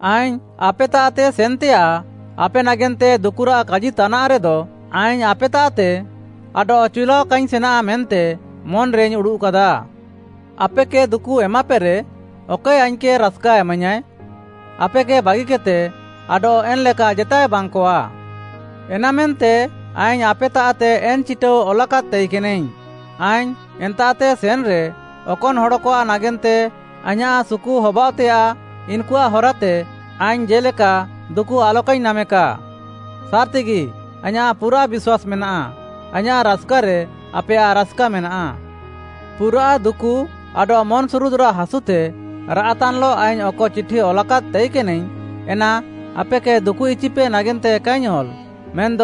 ଆଇଙ୍ଗ୍‌ ଆପେତାଃତେ ସେନ୍‌ତେୟାଃ ଆପେ ନାଗେନ୍ତେ ଦୁକୁରାଃ କାଜିତାନାଃରେଦ, ଆଇଙ୍ଗ୍‌ ଆପେତାଃତେ ଆଡଃ ଚିଉଲାଅ କାଇଙ୍ଗ୍‌ ସେନା ମେନ୍ତେ ମନ୍‌ରେଇଙ୍ଗ୍‌ ଉଡ଼ୁଃକାଦା। ଆପେକେ ଦୁକୁ ଏମାପେରେ, ଅକଏ ଆଇଙ୍ଗ୍‌କେ ରାସ୍‌କା ଏମାଇୟାଁଏ? ଆପେକେ ବାଗିକେଦ୍‌ତେ ଆଡଃ ଏନ୍‌ଲେକା ଜେତାଏ ବାଙ୍ଗ୍‌କଆ। ଏନାମେନ୍ତେ ଆଇଙ୍ଗ୍‌ ଆପେତାଃତେ ଏନ୍‌ ଚିଟାଉ ଅଲାକାଦ୍‌ ତାଇକେନାଇଙ୍ଗ୍‌, ଆଇଙ୍ଗ୍‌ ଏନ୍ତାଃତେ ସେନ୍‌ରେ, ଅକନ୍‌ ହଡ଼କଆଃ ନାଗେନ୍ତେ ଆଇଁୟାଃ ସୁକୁହବାୟଃତେୟାଃ, ଇନ୍‌କୁଆଃ ହରାତେ ଆଇଙ୍ଗ୍‌ ଜେ'ଲେକା ଦୁକୁ ଆଲକାଇଙ୍ଗ୍‌ ନାମେକା। ସାର୍‌ତିଗି ଆଇଁୟାଃ ପୁରାଃ ବିଶ୍ୱାସ୍‌ ମେନାଃ, ଆଇଁୟାଃ ରାସ୍‌କାରେ ଆପେୟାଃ ରାସ୍‌କା ମେନାଃ। ପୁରାଃ ଦୁକୁ ଆଡଃ ମନ୍‌ସୁରୁଦ୍‌ରାଃ ହାସୁତେ ରାଆଃତାନ୍‌ଲଃ ଆଇଙ୍ଗ୍‌ ଅକ ଚିଠି ଅଲାକାଦ୍‌ ତାଇକେନାଇଙ୍ଗ୍‌, ଏନା ଆପେକେ ଦୁକୁଇଚିପେ ନାଗେନ୍ତେ କାଇଙ୍ଗ୍‌ ଅଲ୍‌, ମେନ୍‌ଦ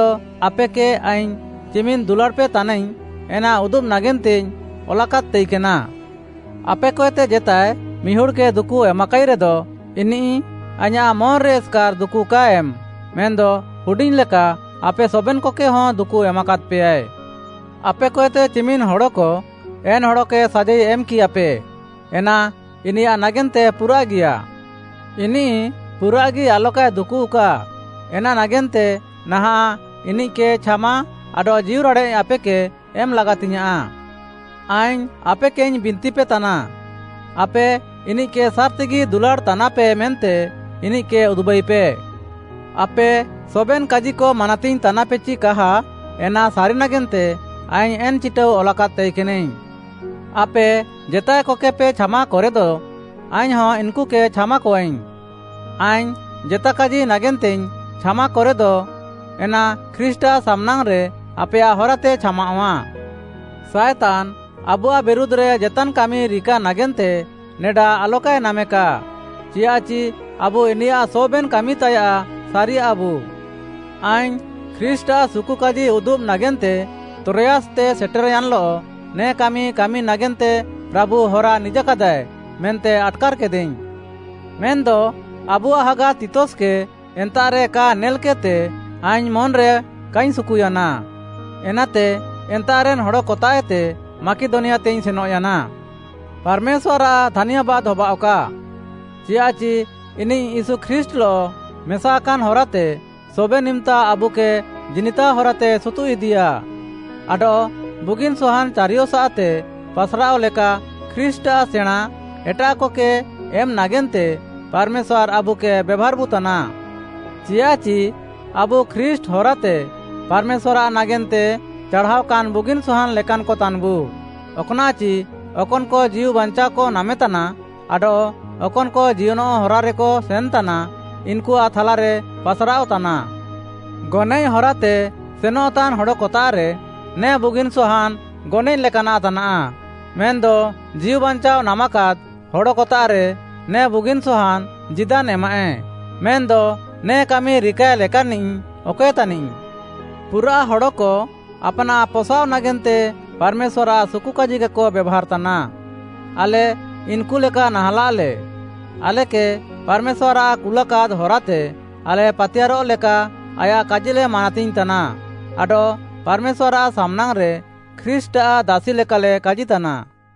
ଆପେକେ ଆଇଙ୍ଗ୍‌ ଚିମିନ୍‌ ଦୁଲାଡ଼୍‌ପେ ତାନାଇଙ୍ଗ୍‌, ଏନା ଉଦୁବ୍‌ ନାଗେନ୍ତେଇଙ୍ଗ୍‌ ଅଲାକାଦ୍‌ ତାଇକେନା। ଆପେକଏତେ ଜେତାଏ ମିହୁଡ଼୍‌କେ ଦୁକୁ ଏମାକାଇରେଦ, ଇନିଃ ଆଇଁୟାଃ ମନ୍‌ରେ ଏସ୍‌କାର୍‌ ଦୁକୁ କାଏ ଏମ୍‌, ମେନ୍‌ଦ ହୁଡିଙ୍ଗ୍‌ ଲେକା ଆପେ ସବେନ୍‌କକେହଁ ଦୁକୁ ଏମାକାଦ୍‌ପେୟାଏ। ଆପେକଏତେ ଚିମିନ୍‌ ହଡ଼କ ଏନ୍‌ ହଡ଼କେ ସାଜାଇ ଏମ୍‌କିୟାପେ, ଏନା ଇନିୟାଃ ନାଗେନ୍ତେ ପୁରାଃଗିୟା। ଇନିଃ ପୁରାଃଗି ଆଲକାଏ ଦୁକୁଃକା, ଏନା ନାଗେନ୍ତେ ନାହାଁଃ ଇନିଃକେ ଛାମା ଆଡଃ ଜୀଉରାଡ଼େଃ ଆପେକେ ଏମ୍‌ ଲାଗାତିଙ୍ଗ୍‌ୟାଁଃ। ଆଇଙ୍ଗ୍‌ ଆପେକେଇଙ୍ଗ୍‌ ବିନ୍ତିପେତାନା, ଆପେ ଇନିଃକେ ସାର୍‌ତିଗି ଦୁଲାଡ଼୍‌ତାନାପେ ମେନ୍ତେ ଇନିଃକେ ଉଦୁବାଇପେ। ଆପେ ସବେନ୍‌ କାଜିକ ମାନାତିଙ୍ଗ୍‌ ତାନାପେ ଚି କାହା, ଏନା ସାରି ନାଗେନ୍ତେ ଆଇଙ୍ଗ୍‌ ଏନ୍‌ ଚିଟାଉ ଅଲାକାଦ୍‌ ତାଇକେନାଇଙ୍ଗ୍‌। ଆପେ ଜେତାଏକକେପେ ଛାମାକରେଦ, ଆଇଙ୍ଗ୍‌ହଁ ଇନ୍‌କୁକେ ଛାମାକଆଇଙ୍ଗ୍‌। ଆଇଙ୍ଗ୍‌ ଜେତା କାଜି ନାଗେନ୍ତେଇଙ୍ଗ୍‌ ଛାମାକରେଦ, ଏନା ଖ୍ରୀଷ୍ଟ୍‌ଆଃ ସାମ୍‌ନାଙ୍ଗ୍‌ରେ ଆପେୟାଃ ହରାତେ ଛାମାଅଃଆ। ସାଏତାନ୍‌ ଆବୁଆଃ ବିରୁଧ୍‌ରେ ଜେତାନ୍‌ କାମିରିକା ନାଗେନ୍ତେ ନେଡା ଆଲକାଏ ନାମେକା, ଚିୟାଃଚି ଆବୁ ଇନିୟାଃ ସବେନ୍‌ କାମିତାୟାଃ ସାରିୟାଃବୁ। ଆଇଙ୍ଗ୍‌ ଖ୍ରୀଷ୍ଟ୍‌ଆଃ ସୁକୁକାଜି ଉଦୁବ୍‌ ନାଗେନ୍ତେ ତ୍ରୋୟାସ୍‌ତେ ସେଟେର୍‌ୟାନ୍‌ଲଃ, ନେ କାମି କାମି ନାଗେନ୍ତେ ପ୍ରାଭୁ ହରା ନିଜାକାଦାଏ ମେନ୍ତେ ଆଟ୍‌କାର୍‌କେଦାଇଙ୍ଗ୍‌। ମେନ୍‌ଦ ଆବୁଆଃ ହାଗା ତିତସ୍‌କେ ଏନ୍ତାଃରେ କା ନେଲ୍‌କେଦ୍‌ତେ, ଆଇଙ୍ଗ୍‌ ମନ୍‌ରେ କାଇଙ୍ଗ୍‌ ସୁକୁୟାନା। ଏନାତେ ଏନ୍ତାଃରେନ୍‌ ହଡ଼କତାଃଏତେ ମାକିଦନିଆତେଇଙ୍ଗ୍‌ ସେନଃୟାନା। ପାର୍‌ମେଶ୍ୱାର୍‌ଆଃ ଧାନ୍ୟାବାଦ୍‌ ହବାଅଃକା। ଚିୟାଃଚି ଇନିଃ ୟୀଶୁ ଖ୍ରୀଷ୍ଟ୍‌ଲଃ ମେସାକାନ୍‌ ହରାତେ ସବେନ୍‌ ଇମ୍‌ତା ଆବୁକେ ଜିନିତାଅ ହରାତେ ସୁତୁଃଇଦିୟାଃ। ଆଡଃ ବୁଗିନ୍‌ ସହାନ୍‌ ଚାରିୟସାଃତେ ପାସ୍‌ରାଅଃ ଲେକା ଖ୍ରୀଷ୍ଟ୍‌ଆଃ ସେଣାଁଁ ଏଟାଃକକେ ଏମ୍‌ ନାଗେନ୍ତେ ପାର୍‌ମେଶ୍ୱାର୍‌ ଆବୁକେ ବେଭାର୍‌ବୁ ତାନା। ଚିୟାଃଚି ଆବୁ ଖ୍ରୀଷ୍ଟ୍‌ ହରାତେ ପାର୍‌ମେଶ୍ୱାର୍‌ଆଃ ନାଗେନ୍ତେ ଚାଢ଼ାଅକାନ୍‌ ବୁଗିନ୍‌ ସହାନ୍‌ ଲେକାନ୍‌କ ତାନ୍‌ବୁ। ଅକ୍‌ନାଃଚି ଅକନ୍‌କ ଜୀଉବାଞ୍ଚାଅକ ନାମେତାନା ଆଡଃ ଅକନ୍‌କ ଜିୟନଃ ହରାରେକ ସେନ୍‌ତାନା, ଇନ୍‌କୁଆଃ ଥାଲାରେ ପାସ୍‌ରାଅଃ ତାନା। ଗନଏଃ ହରାତେ ସେନଃତାନ୍‌ ହଡ଼କତାଃରେ ନେ ବୁଗିନ୍‌ ସହାନ୍‌ ଗନଏଃ ଲେକାନାଃ ତାନାଃ, ମେନ୍‌ଦ ଜୀଉବାଞ୍ଚାଅ ନାମାକାଦ୍‌ ହଡ଼କତାଃରେ ନେ ବୁଗିନ୍‌ ସହାନ୍‌ ଜୀଦାନ୍‌ ଏମାଃଏ। ମେନ୍‌ଦ ନେ କାମି ରିକାଏ ଲେକାନ୍‌ନିଃ ଅକଏ ତାନିଃ? ପୁରାଃ ହଡ଼କ ଆପାନାଃ ପସାଅଃ ନାଗେନ୍ତେ ପାର୍‌ମେଶ୍ୱାର୍‌ଆଃ ସୁକୁକାଜିକେକ ବେଭାର୍‌ତାନା। ଆଲେ ଇନ୍‌କୁ ଲେକା ନାହାଁଲାଃଲେ। ଆଲେକେ ପାର୍‌ମେଶ୍ୱାର୍‌ କୁଲାକାଦ୍‌ ହରାତେ ଆଲେ ପାତିୟାରଃ ଲେକା ଆୟାଃ କାଜିଲେ ମାନାତିଙ୍ଗ୍‌ତାନା ଆଡଃ ପାର୍‌ମେଶ୍ୱାର୍‌ଆଃ ସାମ୍‌ନାଙ୍ଗ୍‌ରେ ଖ୍ରୀଷ୍ଟ୍‌ଆଃ ଦାସି ଲେକାଲେ କାଜିତାନା।